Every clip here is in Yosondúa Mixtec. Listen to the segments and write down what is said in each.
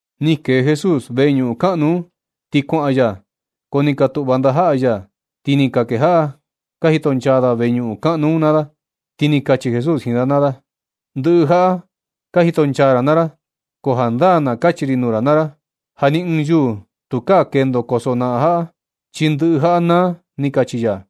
Ni kee Jesús veñuꞌun kaꞌnu un, ti kuaꞌan ya. Ko ni ka tuꞌva ndajaꞌa ya, ti ni ka kejaꞌa ka jitonchaa da veñuꞌun kaꞌnu un naa da. Ti ni kachi Jesús jiin da naa da: ―Ndɨꞌɨ jaꞌa ka jitonchaa ra naa ra. Ko jandaa na kachi ri nuu ra naa ra ja ni ɨɨn yuū tukaa kendo kosojnaꞌan jaꞌa, chi ndɨꞌɨ jaꞌa naa ―ni kachi ya.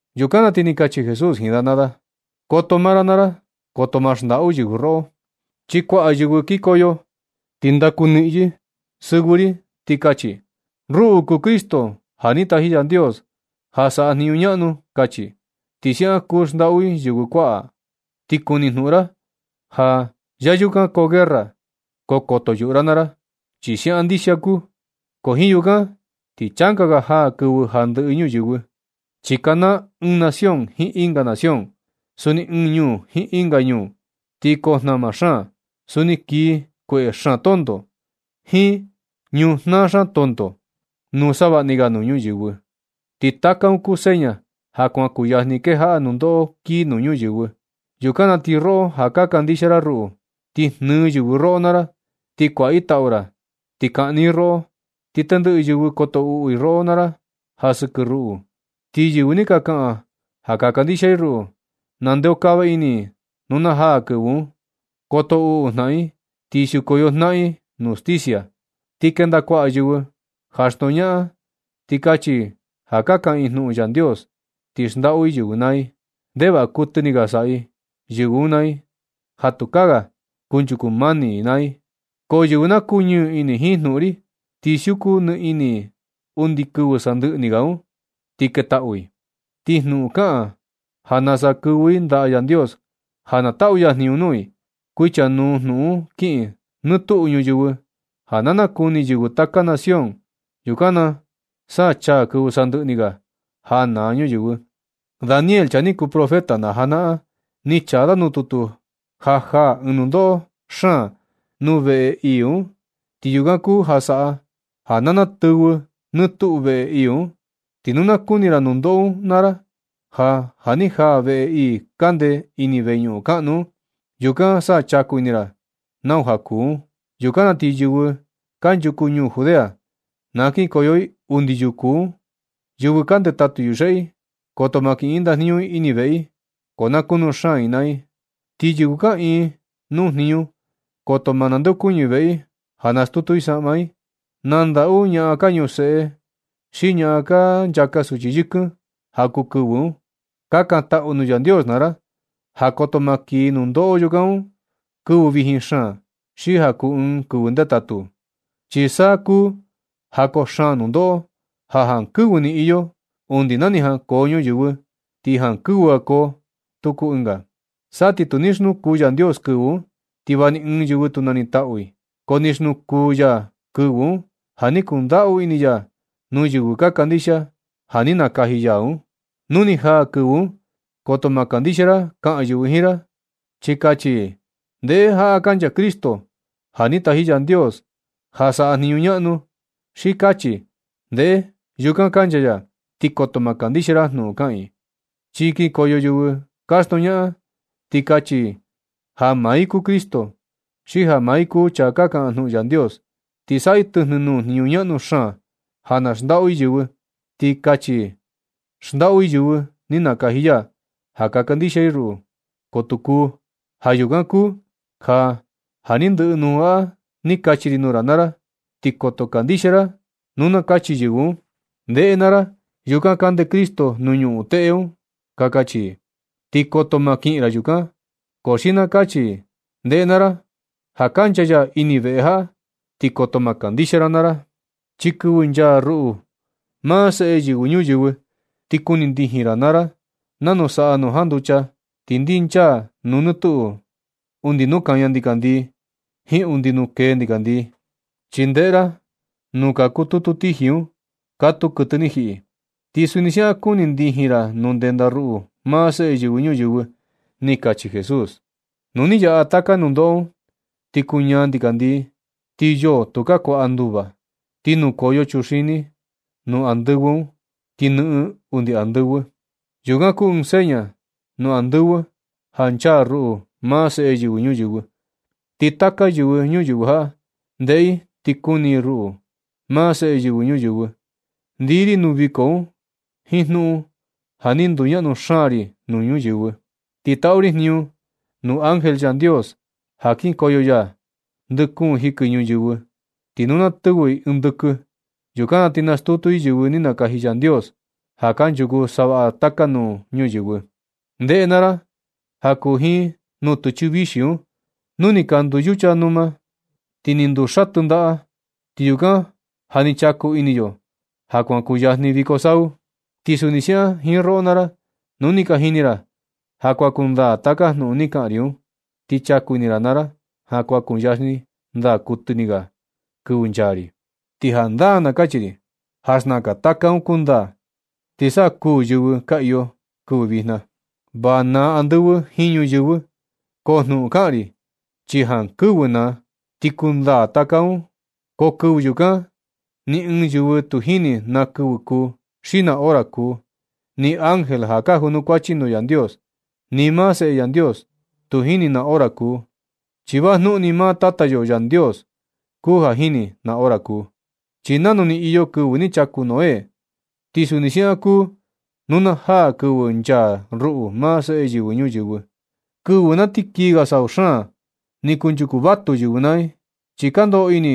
Yukan na ti ni kachi Jesús jiin da naa da: ―Koto maa ra naa ra. Koto maa xndaꞌu yɨvɨ roꞌo. Chi kuaꞌa yɨvɨ kikoyo, ti ndaku niꞌin yɨ sɨvɨ ri, ti kachi: “Ruꞌu kuu Cristo ja ni taji Yandios ja saꞌa jniñu ñaꞌnu”, kachi. Ti siaꞌan kuu xndaꞌu i yɨvɨ kuaꞌa. Ti kuni jnuꞌun ra ja ya yukan koo guerra. Ko koto yuꞌu ra naa ra, chi siaꞌan ndixia kuu, ko jiin yukan ti changa ga jaa kɨvɨ ja ndɨꞌɨ ñuyɨvɨ. Chi kanaa ɨɨn nación jiin ɨnga nación, suni ɨɨn ñuu jiin ɨnga ñuu. Ti koo jnama xaan. Suni kii kueꞌe xaan tonto, jiin ñujnaa xaan tonto nuu savaꞌni ga nuu ñuyɨvɨ. Ti taka un kuu seña ja kuan kuyajni kejaꞌa nundoꞌo kii nuu ñuyɨvɨ. Yukan na ti roꞌo ja ka kandixia ra ruꞌu, ti jnɨɨ yɨvɨ roꞌo naa ra, ti kuaꞌa i tau ra, ti kaꞌni i roꞌo. Ti tendɨꞌɨ yɨvɨ koto uꞌu i roꞌo naa ra ja sɨkɨ ruꞌu. Ti yɨvɨ ni ka kaꞌan ja ka kandixia i ruꞌu, nandeokava ini i nu na jaa kɨvɨ un. Koto uꞌu jnaꞌan i, ti siukoyo jnaꞌan i nuu stisia. Ti kenda kuaꞌa yɨvɨ ja xndoñaꞌan, ti kachi i ja ka kaꞌan i jnuꞌun Yandios, ti xndaꞌu i yɨvɨ naa i. Ndevaꞌa kuɨtɨ ni ga saꞌa yɨvɨ un naa i ja tukaa ga kunchuku mani i naa i. Ko yɨvɨ na kuñɨɨ ini jiin jnuꞌun ri, ti siuku ni ini i undi kɨvɨ sandɨꞌɨ ni ga un, ti ketaꞌu i. Ti jnuꞌun kaꞌan ja nasa kɨvɨ i ndaꞌa Yandios ja na taꞌu ya jniñu nuu i, kuichanuu jnuꞌun un kiꞌin nɨɨ tuꞌu ñuyɨvɨ ja na nakuni yɨvɨ taka nación. Yukan na sa chaa kɨvɨ sandɨꞌɨ ni ga ja naa ñuyɨvɨ. Daniel, chaa ni kuu profeta na janaꞌan un, ni chaa da nuu tutu ja jaa ɨɨn nundoꞌo xaan nuu veꞌe ii un, ti yukan kuu ja saꞌa ja natɨvɨ nɨɨ tuꞌu veꞌe ii un. Ti nu na kuni ra nundoꞌo un naa ra ja, ja ni jaa veꞌe ii kande ini veñuꞌun kaꞌnu un, yukan sa chaku ini ra nau ja kuu un. Yukan na ti yɨvɨ kanchuku ñuu Judea, na kinkoyo i undi yuku un. Yɨvɨ ka ndetatu yuxeꞌe i, koto ma kiꞌin i ndajniñu i ini veꞌe i, ko na kunu xaan i naa i. Ti yɨvɨ kaꞌiin nuu jniñu, koto maa ndeokuñɨ i veꞌe i ja stutu i saꞌma i. ¡Na ndaꞌu ñaꞌan ka ñuseꞌe xi ñaꞌan ka nchaka suchi yɨkɨn ja kuu kɨvɨ un! Kakantaꞌu nuu Yandios naa ra ja koto maa kii nundoꞌo yukan nuu ra kɨvɨ vijin xaan, xi ja kuu ɨɨn kɨvɨ ndetatu. Chi saa kuu ja koo xaan nundoꞌo, ja jankɨvɨ ni iyo undi na ni jankoo ñuyɨvɨ, ti ni jankɨvɨ ga koo tuku ɨnga. Sa ti tu ni xnuku Yandios kɨvɨ un, ti va ni ɨɨn yɨvɨ tu nanitaꞌu i. Ko ni xnuku ya kɨvɨ un ja ni kundaꞌu ini ya nuu yɨvɨ ka kandixia, ja ni nakaji ya un. Nu ni jaa kɨvɨ un, koto ma kandixia ra kaꞌan yɨvɨ jiin ra, chi kachi i: “Ndeꞌe, jaꞌa kancha Cristo ja ni taji Yandios ja saꞌa jniñu ñaꞌnu”, xi kachi: “Ndeꞌe, yukan kancha ya.” Ti koto ma kandixia ra jnuꞌun kaꞌan i. Chi kikoyo yɨvɨ ka xndoñaꞌan, ti kachi i ja maa i kuu Cristo, xi ja maa i kuu chaa kaꞌan jnuꞌun Yandios, ti saꞌa i tɨjnɨ nuu jniñu ñaꞌnu xaan ja na xndaꞌu i yɨvɨ. Ti kachi i xndaꞌu i yɨvɨ ni nakaji ya ja ka kandixia i ruꞌu, ko tu kuu. Ja yukan kuu ja, ja ni ndɨꞌɨ jnuꞌun jaꞌa ni kachi ri nuu ra naa ra, ti koto kandixia ra nu na kachi yɨvɨ un: “Ndeꞌe naa ra, yukan kande Cristo nuu ñuꞌun teꞌe un”, ka kachi i. Ti koto maa kiꞌin ra yukan. Ko xi nu na kachi i: “Ndeꞌe naa ra. Ja kancha ya ini veꞌe jaꞌa”, ti koto ma kandixia ra naa ra. Chi kɨvɨ nchaa ruꞌu, maa Seꞌe Yɨvɨ Ñuyɨvɨ, ti kuni ndijin ra naa ra nanu saꞌa nu janducha, ti ndinchaa nɨ tuꞌu undi nuu kaña ndikandii jiin undi nuu kee ndikandii. Chi ndeꞌe ra ja nuu ka kututu tiji un, katuu kɨtɨ ni jiꞌi, ti suni siaꞌan kuni ndijin ra nu ndenda ruꞌu, maa Seꞌe Yɨvɨ Ñuyɨvɨ ―ni kachi Jesús. Nu ni yaꞌa taka nundoꞌo un, ti kuu ñaa ndikandii, ti yoo tukaa ga kuaꞌa nduva. Ti nukoyo chuxini nuu andɨvɨ un, ti nɨꞌɨn undi andɨvɨ. Yukan kuu ɨɨn seña nuu andɨvɨ ja nchaa ruꞌu, maa Seꞌe Yɨvɨ Ñuyɨvɨ. Ti taka yɨvɨ ñuyɨvɨ jaꞌa, ndeꞌe i ti kuni i ruꞌu, maa Seꞌe Yɨvɨ Ñuyɨvɨ, ndii ri nuu viko un jiin jnuꞌun ja ni nduñaꞌnu xaan ri nuu ñuyɨvɨ. Ti taꞌu ri jniñu nuu ángel, Yandios ja kinkoyo ya ndɨ kuun jɨkɨ ñuyɨvɨ. Ti nu na tɨvɨ ɨɨn ndɨkɨ, yukan na ti nastutu i yɨvɨ ni nakaji Yandios, ja kanchuku savaꞌa taka nuu ñuyɨvɨ. Ndeꞌe naa ra ja kuu jiin nutɨchɨ vixi un. Nu ni ka nduu yucha numa i ti ni nduu xatɨ ndaꞌa, ti yukan ja ni chaku ini yo ja kuan kuyajni viko sau. Ti suni siaꞌan jiin roꞌo naa ra, nu ni ka jini ra ja kuan kundaa taka jnuꞌun ni kaꞌan ri un, ti chaku ini ra naa ra ja kuan kuyajni ndaa kuɨtɨ ni ga kɨvɨ nchaa ri. Ti jandaa na kachi ri ja xnaka taka un kundaa, ti sa kuū yɨvɨ ka iyo kɨvɨ vijna. Va naa andɨvɨ jiin ñuyɨvɨ, ko jnuꞌun kaꞌan ri, chi jankɨvɨ naa, ti kundaa taka un. Ko kɨvɨ yukan, ni ɨɨn yɨvɨ tu jini na kɨvɨ kuu, xi na hora kuu, ni ángel ja ka junukuachi nuu Yandios, ni maa Seꞌe Yandios, tu jini na hora kuu. Chi vajnuꞌun ni maa Tata yo Yandios kuu ja jini na hora kuu. Chi nanu ni iyo kɨvɨ ni chaku Noé, ti suni siaꞌan kuu nu na jaa kɨvɨ nchaa ruꞌu, maa Seꞌe Yɨvɨ Ñuyɨvɨ. Kɨvɨ na ti kii ga sau xaan un, ni kunchuku vatu yɨvɨ naa i, chi ka ndoꞌo ini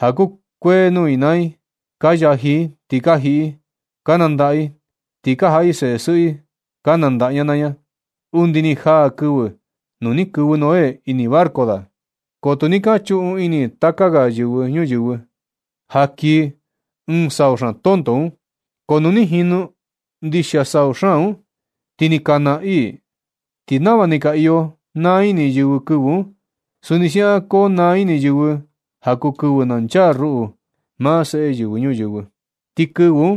ja kukuee nuu i naa i. Ka yaji i, ti ka jiꞌi i, ka nandaꞌa i, ti ka jaꞌa i seꞌe sɨꞌɨ i ka nandaꞌa ña naa ña, undi ni jaa kɨvɨ nu ni kɨvɨ Noé ini barco da. Ko tu ni ka chuꞌun ini taka ga yɨvɨ ñuyɨvɨ un ja kii ɨɨn sau xaan tonto un. Ko nu ni jinu ndixia sau xaan un, ti ni ka naa i. Ti nava ni ka iyo naa ini yɨvɨ kɨvɨ un, suni siaꞌan konaa ini yɨvɨ ja kuu kɨvɨ na nchaa ruꞌu, maa Seꞌe Yɨvɨ Ñuyɨvɨ. Ti kɨvɨ un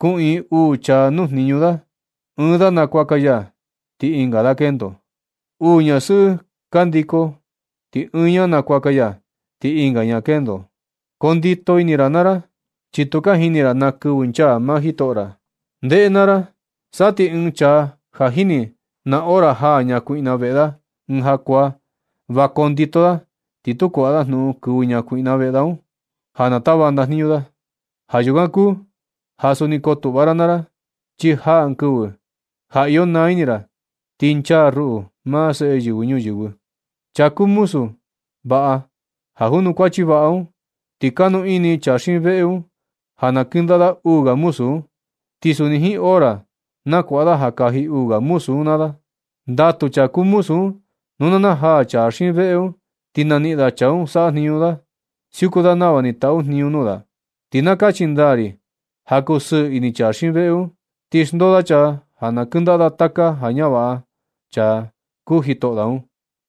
kuꞌiin uu chaa nuu jniñu da, ɨɨn da nakuaka ya, ti ɨnga da kendo. Nu uu ñasɨꞌɨ ka ndiko, ti ɨɨn ña nakuaka ya, ti ɨnga ña kendo. Kondito ini naa ra, chi tu ka jini ra na kɨvɨ nchaa maa jitoꞌo ra. Ndeꞌe naa ra, sa ti ɨɨn chaa ja jini da na hora jaa ñakuiꞌna veꞌe da ɨɨn jakuaa, va kondito da, ti tu kuaꞌa da jnuꞌun kɨvɨ ñakuiꞌna veꞌe da un, ja na tava ndajniñu da. Ja yukan kuu ja suni kotuꞌva ra naa ra, chi jaa ɨɨn kɨvɨ, ja iyo naa ini ra, ti nchaa ruꞌu, maa Seꞌe Yɨvɨ Ñuyɨvɨ. Chaa kuu muzu vaꞌa ja junukuachi vaꞌa un, ti kanu ini chaa xiin veꞌe un ja na kɨndaꞌa da uu ga muzu un, ti suni jiin hora na kuaꞌa da ja kaji uu ga muzu un naa da. Ndatu chaa kuu muzu un nu na najaa chaa xiin veꞌe un, ti naniꞌin da chaa saꞌa jniñu da, siuku da nava ni taꞌu jniñu nuu da. Ti na kachi ndaa ri ja kusɨɨ ini chaa xiin veꞌe un, ti xndoo da chaa ja na kɨndaꞌa da taka ja ñavaꞌa chaa kuu jitoꞌo da un.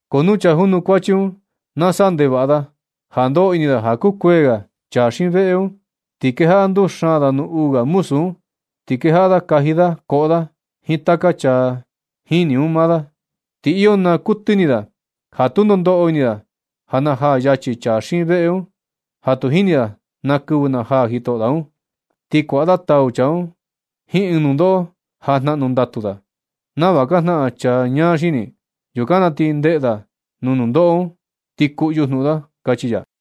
Ko nu chaa junukuachi un na saꞌa ndevaꞌa da, ja ndoꞌo ini da ja kukuee ga chaa xiin veꞌe un, ti kejaꞌa nduxaan da nuu uu ga muzu un, ti kejaꞌa da kaji da, koꞌo da jiin taka chaa jini un naa da. Ti iyo naa kuɨtɨ ini da, ja tundo ndoꞌo ini da ja najaa yachi chaa xiin veꞌe un, ja tu jini da na kɨvɨ najaa jitoꞌo da un. Ti kuaꞌa da tau chaa un jiin ɨɨn nundoꞌo ja jnaꞌnu ndatu da, nava ka jnaꞌan chaa ñaa xini. Yukan na ti ndeꞌe da nuu nundoꞌo un, ti kuꞌyu jnuꞌun da ―kachi ya.